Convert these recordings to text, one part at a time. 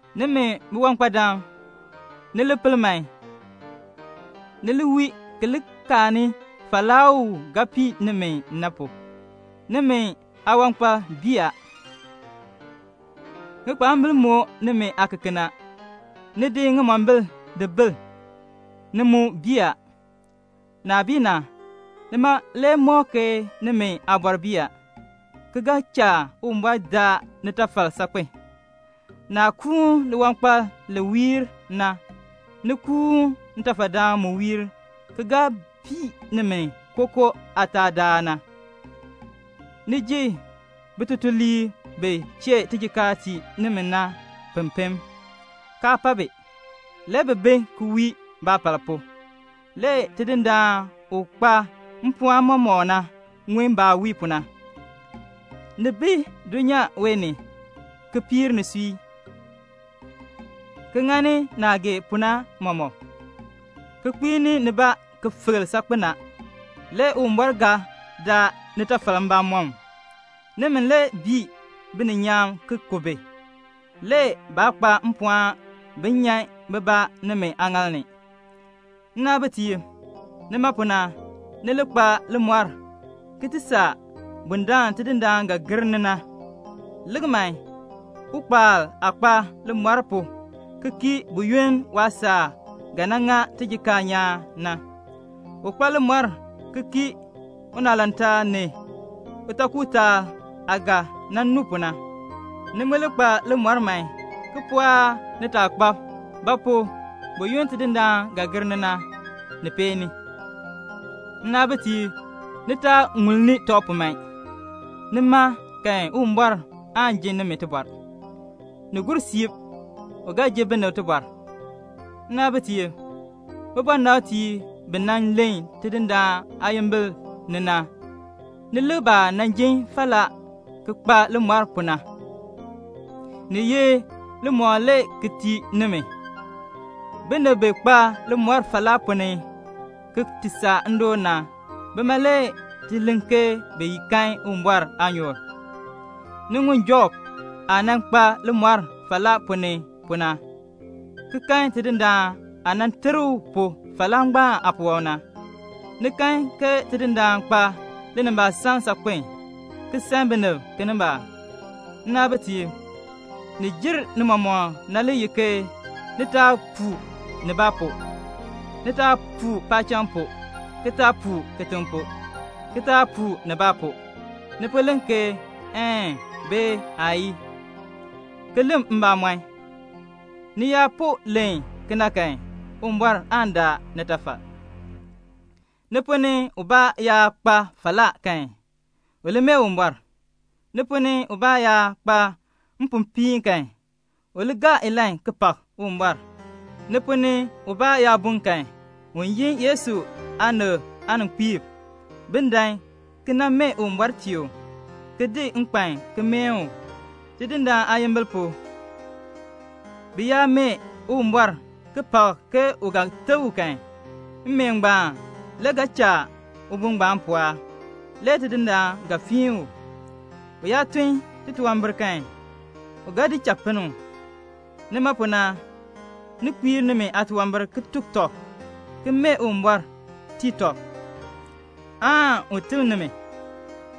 Nimi biwankpadam, ni pel man, ni li wii ki li kaani falaa u ga pii nimi na pu. Nimi aawankpal bii a. Ŋikpaambil moo nimi aakeken a. Ni di ŋimombil di bil, ni mu bii a. Naah bii na, nima le mɔk ke nimi aabɔr bii a, ki ga cha Uwumbɔr daa nitafal saakpen. Naah kuun liwankpal li wiir na, ni kuun ntafadaan mu wiir ki ga pii nimi kookoo aataadaal na. Ni ji bitutuliib bi chee tijikaar tii nimi na pempem, kaa pa bi. Le bi bi ki wii baapal pu. Le Tidindaan u kpa mpɔɔn mɔmɔk na ŋun baah wii pu na. Ni bi dulnyaa wee ni, ki piir nisui, ki ŋani naah gee pu na mɔmɔk, ki kpiini nibaa ki filk saakpen a; le Uwumbɔr ga daa nitafal mbamɔm. Nimi le bii bininyaan ki ku bi, le baa kpa mpɔɔn bin nyan bibaa nimi aaŋaal ni. Nnaabitiib, nima pu na, ni li kpa limɔr ki ti saa bundaln Tidindaan ga gir ni na. Lik man, ukpaal aah kpa limɔr pu ki kii buyoonn waasaak ga nan ŋa tijikaar nyaan na. U kpa limɔr ki kii unaalantaal ni utaakutaal aah ga nan nu pu na. Ni mu li kpa limɔr man, ki pɔɔk nitaakpab; ba pu? buyoonn Tidindaan ga gir ni na, ni peeni. Nnaabitiib, ni taa ŋulni tɔb pu man. Nima kan Uwumbɔr aan ji nimi tibɔr. Ni gur siib, u ga ji binib tibɔr. Nnaabitiib, bibɔnabtiib bi nan len Tidindaan aayimbil ni na, ni lik baah nan jin falaa ki kpa limɔr pu na, ni ye limɔkl le ki tii nimi. Binib bi kpa limɔr falaa ponn ni ki ti saa naadoon na, bima le ti len ke bi kan Uwumbɔr aanyoor. Ni ŋun Job aah nan kpa limɔr falaa ponn ni pu na, ki kan Tidindaan aah nan ter u pu falaa ngbaan aapuwɔb na. Ni kan ke Tidindaan kpa linimbaasaln saakpen, ki san binib kinimbaak. Nnaabitiib, ni jer ni mɔmɔk na le ye ke ni taa puu nibaa pu. Ni taa puu paacham pu, ki taa puu kitiŋ pu, ki taa puu nibaa pu. Ni po len ke "Een," bee "Aayii," ki len mbamɔn. Ni yaa po len kena kan, Uwumbɔr aan daa nitafal. Ni ponn ni ubaa yaa kpa falaa kan, u li mee Uwumbɔr. Ni ponn ni ubaa yaa kpa mpopiin kan, u li gaa ilahn ki pak Uwumbɔr. Ni ponn ni ubaa yaa bun kan, un yin Yesu aanib aaninkpiib, bin dan ki nan mee Uwumbɔr tii u, ki di nkpan ki meen u, Tidindaan aayimbil pu. Bi yaa mee Uwumbɔr ki pak ke u ga teb u kan, mmeen ngbaan le ga cha ubun ngbaan pɔɔk, le Tidindaan ga fiin u. U yaa tun titunwambir kan, u ga di cha pinn u. Nima pu na, ni kpiir nimi aatunwambir ki tuk tɔb, ki mee Uwumbɔr tii tɔb, aan un teb nimi.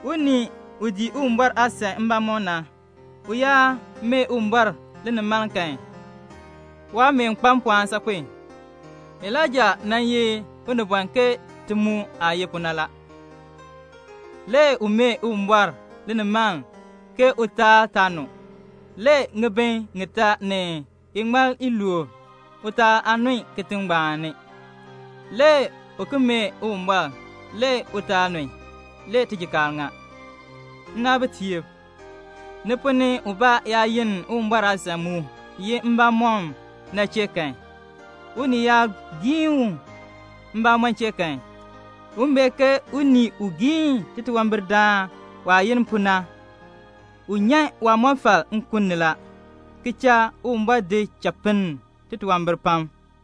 Unii u dii Uwumbɔr aasan mbamɔm na, u yaa mee Uwumbɔr linimaln kan, waameen kpa mpɔɔn saakpen. Elaija nan ye unibɔn ke ti mu aah ye pu na. Le u mee Uwumbɔr linimaln ke utaal taa nu. Le ŋibin ŋitaa ni iŋmal iluub utaal aa nun kitiŋ ngbaan ni. Le u ki mee Uwumbɔr, le utaal nun, le tijikaar ŋa. Nnaabitiib, ni ponn ni ubaa yaa yenn Uwumbɔr aasan mu ye mbamɔn na chee kan, unii yaa giin u mbamɔn chee kan, un bee ke unii u giin titunwambirdaan waah yenn pu na, u nyan waamɔfal nkun ni la, ki cha Uwumbɔr di cha pinn titunwambir pam.